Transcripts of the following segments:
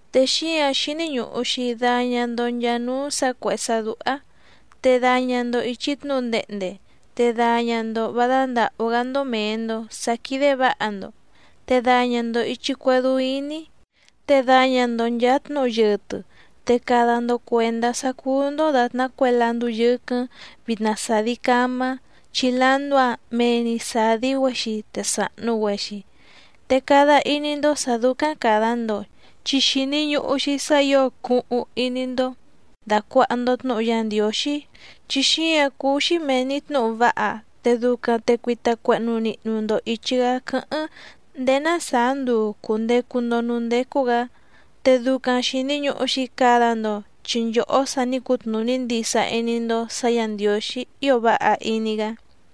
Te xíǎⁿ xíní ñùhu‑xi daña‑ndo nchaa núú sǎ cuèhé sá dúhá, te daña‑ndo ìchi tnúhu ndehnde, te daña‑ndo vǎ dándàhú‑gá‑ndó mèe‑ndo sá quídé vǎha‑ndo, te daña‑ndo ìchi cuedú íní, te daña‑ndo nchàa tnúhu yɨtɨ. Te cada‑ndo cuèndá sá cúú‑ndó dàtná cue landú yɨ́quɨ́ⁿ vìtna sadi camá, chi landú‑áⁿ mee‑ni sàdi‑güexi te sàhnu‑güexi. Te cada iní‑ndó sǎ dúcáⁿ càda‑ndo chi xìni ñuhu‑xi sá ǐo cuhuⁿ iní‑ndó dàcuaha‑ndo tnúhu Yá Ndiǒxí, chi xíǎⁿ cúú‑xí mèe‑ni tnúhu váha, te ducaⁿ te cuita cuehnu nihnu‑ndo ìchi‑gá quɨ́hɨ́ⁿ ndéé ná sàá nduu cùndecu‑ndo núú ndécú‑gǎ. Te ducaⁿ xìni ñuhu‑xi cada‑ndo, chi nchòhó sa ní cutnùní ndisa iní‑ndó sǎ Yǎ Ndiǒxí ío váha iní‑gá.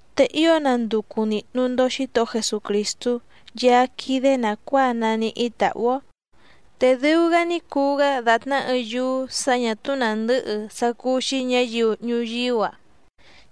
Te ío nanducu nìhnu‑ni‑ndo Xítohó Jesucrìstú Yaá quídé nàcuáa naníhí tàhú‑ó. Te dɨu‑gá ní cuu‑gá dàtná ɨɨⁿ yúú sǎ ñà túú nàndɨhɨ sá cúú‑xí ñǎyiu ñuyíú‑a,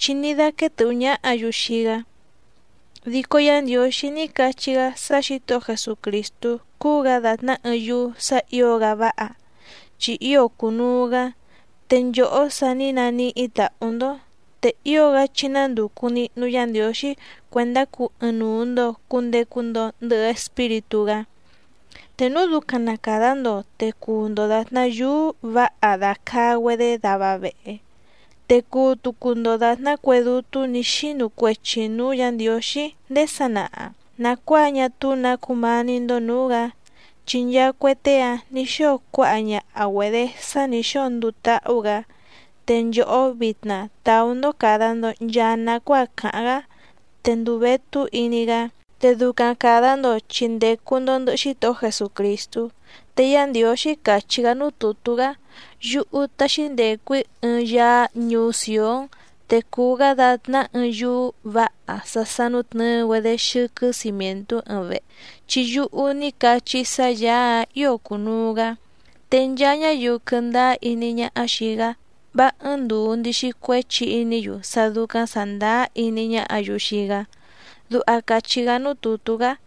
chi ní dáquéé tɨ̀hú ñáhǎ‑yu xii‑gá. Dico Yá Ndiǒxí ní cachí‑gá sá Xǐtohó Jesucrìstú cúú‑gǎ dàtná ɨɨⁿ yúú sǎ ǐo‑gá váha, chi ío cùnuu‑gá. Te nchòhó sa ní naníhí tàhú‑ndó, te ío‑gá chí nándùcu nihnu Yá Ndiǒxí cuèndá cuu ɨɨⁿnuu‑ndo cùndecu‑ndo ndɨhɨ Espíritú‑gá. Te núu ducaⁿ na càda‑ndo te cuu‑ndo dàtná yúú vǎha dàcaa‑güedé dava vehe, te cuu tucu‑ndo dàtná cue dútú nǐ xinu cuechi nǔú Yǎ Ndiǒxí ndéé sanaha, nàcuáa ñá túú nǎ cumání‑ndó nǔú‑gǎ, chi nchaa cue tée‑áⁿ nǐ xóo cuáha ñaha‑güedě sá nǐ xóo nduu táhú‑gǎ. Te nchòhó vitna tàú‑ndó càda‑ndo nchaa nacuáa càháⁿ‑gá, te nduu vétú iní‑gá. Te ducaⁿ càda‑ndo chi ndècu‑ndo ndɨhɨ Xítohó Jesucrìstú. Te Yá Ndiǒxí càchí‑gá núú tùtú‑gá: Yúhú taxi ndecu‑í ɨɨⁿ Yaá ñuú Sìón, te cuu‑gá dàtná ɨɨⁿ yúú vǎha sá sánútnɨ̌ɨ‑güedé xɨ́quɨ́ cimièntú ɨɨⁿ vehe, chi yúhú ní cachí‑í sá Yàá‑áⁿ ǐo cunuu‑gǎ. Te nchaa ñáyiu quɨ̀ndáá iní ñáhá xìi‑gá vá ɨ́ɨ́ⁿ ndùu ndixi cuéchi iní‑yu sá dúcáⁿ sàndáá iní ñáhǎ‑yu xii‑gá. Duha càchí‑gá núú tùtú‑gá.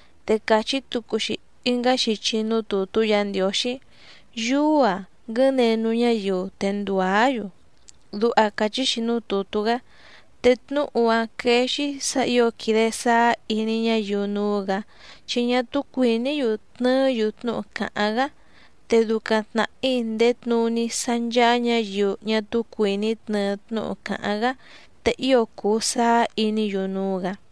Te càchí tucu‑xi ɨngá xichi núú tùtú Yǎ Ndiǒxí: Yúú‑ǎⁿ nguɨ̌nenu ñáyiu te ndùá‑yu. Duha càchí‑xi núú tùtú‑gá. Te tnúhu‑áⁿ quéé‑xí sǎ ǐo quìde sáá iní ñáyiu núú‑gǎ, chi ñá túú cuìní‑yu tnɨɨ́‑yu tnúhu càháⁿ‑gá, te ducaⁿ tnàhí ndèé tnuní sá ncháá ñǎyiu ñá túú cuìní tnɨɨ tnúhu càháⁿ‑gá, te ío cùu sáá iní‑yu núú‑gǎ.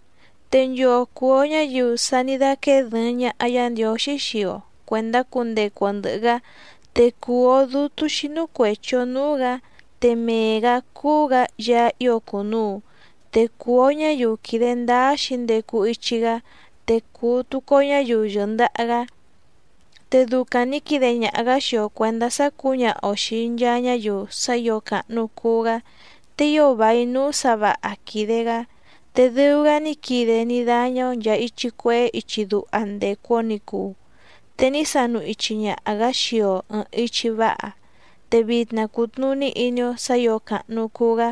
Te nchoo cùu‑o ñáyiu sa ní dáquéé dɨ̀ɨⁿ ñaha Yá Ndiǒxí xii‑o cuèndá cundecu‑o ndɨ̀hɨ‑gá, te cùu‑o dútú xínú cuèchi‑o núú‑gǎ, te mee‑gǎ cúú‑gǎ Yaá ío cùnuu, te cùu‑o ñáyiu quìde ndáá xǐndecu ichi‑gá te cùu tucu‑o ñáyiu yɨ̀ndaha‑gá. Te ducaⁿ nǐ quide ñaha‑gǎ xii‑o cuèndá sá cǔñaha‑o xìi nchaa ñáyiu sá ǐo càhnu cuu‑gá, te ío vài núú sǎ vǎha quìde‑gá, te dɨu‑gá ní quide ní dáñá‑ó nchàa ichi cuehé ichi duha ndècu‑o ní cuu, te ní sanu ichi ñaha‑gǎ xii‑o ɨ̀ɨⁿ ichi váha, te vitna cùtnuní iní‑ó sǎ ǐo càhnu cuu‑gá.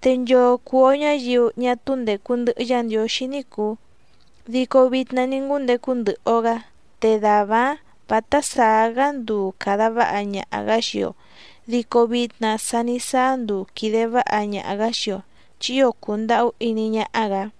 Te nchoo cùu‑o ñáyiu ñá túú ndècu ndɨhɨ Yá Ndiǒxí ní cùu, dico vitna ní ngúndecu ndɨhɨ‑o‑gǎ, te dàvá‑áⁿ vǎtá sàá‑gá nduu càda váha ñaha‑gǎ xii‑o, dico vitna sa ní sáá nduu quìde váha ñaha‑gǎ xii‑o, chi ío cùndahú iní ñáhá‑gǎ.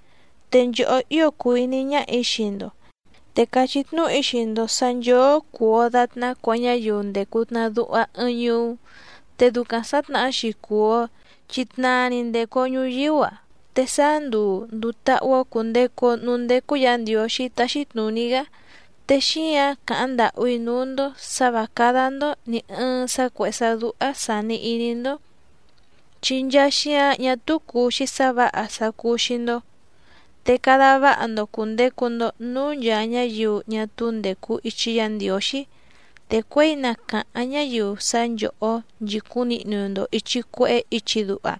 Te nchòhó ío cùu iní ñáhà‑í xii‑ndo, te càchí tnúhu‑í xii‑ndo sǎ nchóó cùu‑o datná cue ñáyiu ndècu tnaduha ɨɨⁿ ñuú, te ducaⁿ sǎtnahá‑xi cùu‑o chi tnaa‑ni ndècu‑o ñuyíú‑a, te sáá nduu ndùu táhú‑ó cùndecu‑o núú ndécú Yǎ Ndiǒxí táxí tnùní‑gá, te xíǎⁿ càháⁿ ndàhú‑í núú‑ndó sǎ vǎ cádá‑ndó nì ɨɨⁿ sá cuèhé sá dúhá sàni iní‑ndó, chi nchaa xíǎⁿ ñá túú cùu‑xi sá vǎha sá cúú‑xí‑ndó. Te cada váha‑ndo cùndecu‑ndo núú nchàa ñáyiu ñá túú ndècu ichi Yá Ndiǒxí, te cuěi na càháⁿ ñáyiu sá nchòhó nchìcúⁿ nihnu‑ndo ìchi cuehé ichi duha,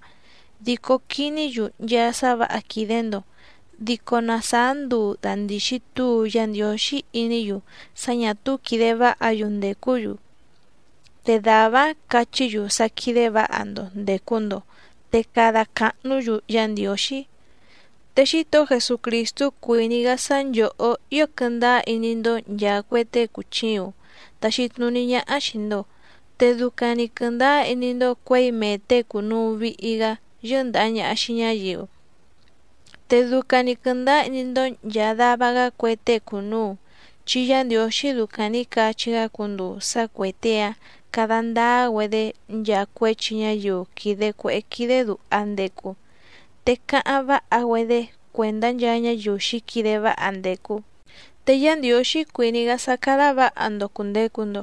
dico quiní‑yu nchaa sá vǎha quìde‑ndo, dico na sàá nduu dàndixi túu Yá Ndiǒxí iní‑yu sá ñà túú quìde váha‑yu ndècú‑yu, te dàvá‑áⁿ cachí‑yu sá quídé vǎha‑ndo ndècu‑ndo, te cada càhnú‑yu Yá Ndiǒxí. Te Xítohó Jesucrìstú cuìní‑gá sá nchòhó ío quɨndáá iní‑ndó nchàa cue tée cùchiuⁿ taxi tnuní ñáhá xìi‑ndo, te ducaⁿ‑ni quɨ̀ndáá iní‑ndó cuěi mee těe cùnuu vihi‑gá yɨ́ndàha ñaha xii ñáyiu. Te ducaⁿ‑ni quɨ̀ndáá iní‑ndó nchàa dava‑gá cue tée cùnuu, chi Yá Ndiǒxí ducaⁿ nǐ cachí‑gá cunduu sá cuè tée‑áⁿ cada ndáá‑güedé nchaa cuéchi ñáyiu quìde cuehé quídé dùha ndecu, te cáháⁿ váha‑güedé cuèndá nchaa ñáyiu xǐquide váha ndècu. Te Yá Ndiǒxí cuìní‑gá sá cádá vǎha‑ndo cùndecu‑ndo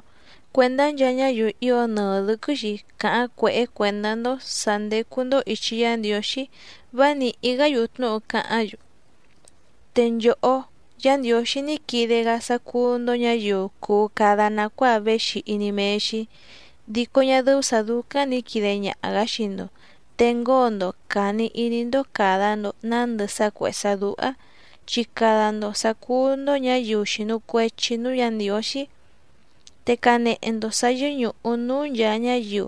cuendá nchaa ñáyiu ío nɨɨ dɨ̌quɨ́‑xi càháⁿ cuèhé cuèndá‑ndó sǎ ndécú‑ndó ìchi Yá Ndiǒxí vá nìhí‑gá‑yu tnúhu cáháⁿ‑yu. Te nchòhó, Yá Ndiǒxí ní quide‑gá sá cúú‑ndó ñǎyiu cuu cada nàcuáa véxi iní méé‑xí, dico ñá dɨ́ú sǎ dúcáⁿ nǐ quide ñaha‑gǎ xii‑ndo, te ngóo‑ndo càni iní‑ndó càda‑ndo nándɨ sá cuèhé sá dúhá, chi cada‑ndo sǎ cúú‑ndó ñǎyiu xìnu cuechi núú Yǎ Ndiǒxí. Te canehe‑ndo sǎ yɨ́ñùhu núú nchàa ñáyiu,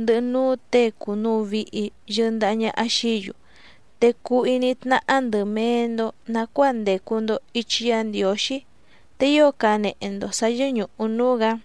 ndɨhɨ núú těe cùnuu vihi yɨndaha ñaha xií‑yu, te cuu iní tnáhá ndɨ̀ mee‑ndo nacuáa ndècu‑ndo ichi Yá Ndiǒxí, te ío canehe‑ndo sǎ yɨ́ñùhu núú‑gǎ.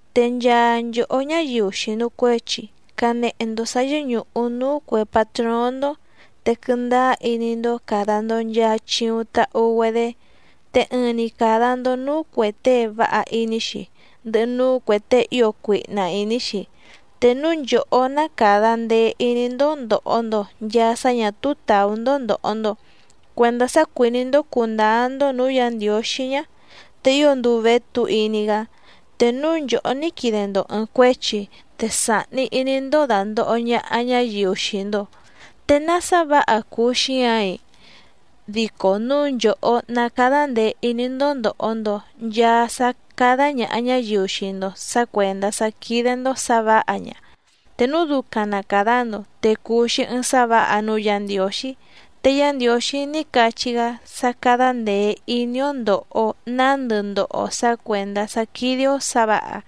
Te nchaa nchòhó ñáyiu xìnu cuechi canehe‑ndo sǎ yɨ́ñùhu núú cuè patróóⁿ‑ndó, te quɨndáá iní‑ndó càda‑ndo nchaa chiuⁿ tahu‑güedé. Te ɨɨⁿ‑ni càda‑ndo núú cuè tée váha iní‑xi, ndɨhɨ núú cuè tée ío cuihna ìní‑xi. Te núu nchòhó ná càda ndee iní‑ndó ndòho‑ndo nchaa sá ñà túú tàú‑ndó ndòho‑ndo cuendá sá cuìní‑ndó cùndáá‑ndó nǔú Yǎ Ndiǒxí ñá, te ío nduu vétú iní‑gá. Te núu nchòhó ní quide‑ndo ɨ̀ɨⁿ cuéchi, te sàhni iní‑ndó dàndoho ñaha ñáyiu xii‑ndo, ¿te ná sá vǎha cùu xíǎⁿ‑i? Dico núu nchòhó ná cádá ndèe iní‑ndó ndòho‑ndo nchaa sá cádá ñàha ñáyiu xii‑ndo sǎ cuèndá sá quídé‑ndó sǎ vǎha ña, te núu ducaⁿ na càda‑ndo te cùu‑xi ɨɨⁿ sá vǎha núú Yǎ Ndiǒxí. Te Yá Ndiǒxí ní cachí‑gá sá cádá ndèe iní‑ó ndòho‑o nándɨ ndoho‑o sǎ cuèndá sá quídé‑ó sǎ vǎha,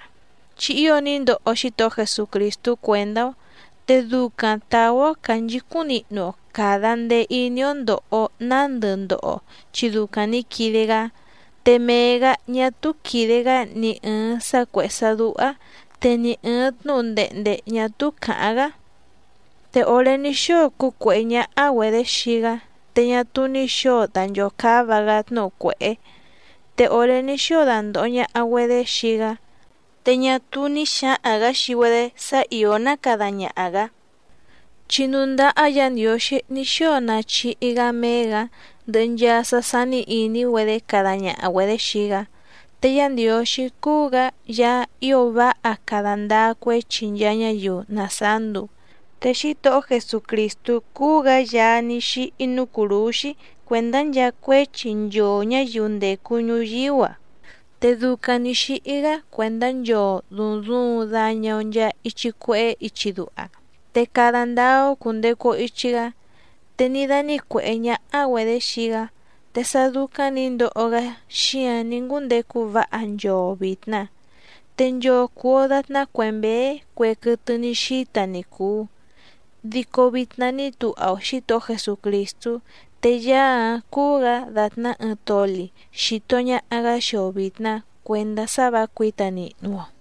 chi ío ní ndoho Xítohó Jesucrìstú cuèndá‑ó, te ducaⁿ tàú‑ó cànchicúⁿ nihnu‑o càda ndee iní‑ó ndòho‑o nándɨ ndoho‑o, chi ducaⁿ nǐ quide‑gá. Te mee‑gǎ ñá túú quìde‑gá ni ɨ̀ɨⁿ sá cuèhé sá dúhá, te ni ɨ̀ɨⁿ tnúhu ndehnde ñà túú càháⁿ‑gá. Te òré ní xóo cúcuèhé ñáhá‑güedě xii‑gá, te ñá túú ní xǒo danchòcáva‑gá tnúhu cuèhé, te òré ní xóo dandòho ñaha‑güedé xii‑gá, te ñá túú ní xǎhaⁿ‑gǎ xii‑güedé sá ìó ná cada ñaha‑gǎ, chi núú ndáhá Yǎ Ndiǒxí ní xóo nachihi‑gá méé‑gǎ, ndɨhɨ nchaa sá sání ìní‑güedé cada ñaha‑güedě xii‑gá. Te Yá Ndiǒxí cúú‑gǎ Yaá ío váha cada ndáá cuéchi nchaa ñáyiu na sàá nduu. Te Xítohó Jesucrìstú cúú‑gǎ Yaá ní xíhí núú cùrúxí cuèndá nchaa cuéchi nchoo ñǎyiu ndècu ñuyíú‑a. Te ducaⁿ nǐ xíhí‑gá cuèndá nchoo dùuⁿ duuⁿ daña‑o nchaa ichi cuehé ichi duha, te cada ndáá‑ó cùndecu‑o ichi‑gá. Te ní dánǐcuèhé ñáhá‑güedě xii‑gá, te sá dúcáⁿ nǐ ndoho‑gá xíǎⁿ ní ngúndecu váha nchoo vìtna. Te nchoo cùu‑o datná cue mběé cue quɨtɨ ní xíta ni cùu, dico vitna ní tuha‑o Xǐtohó Jesucrìstú, te Yaá‑áⁿ cúú‑gǎ dàtná ɨɨⁿ toli xìto ñaha‑gá xii‑o vìtna cuendá sá vǎ cuǐta nihnu‑o.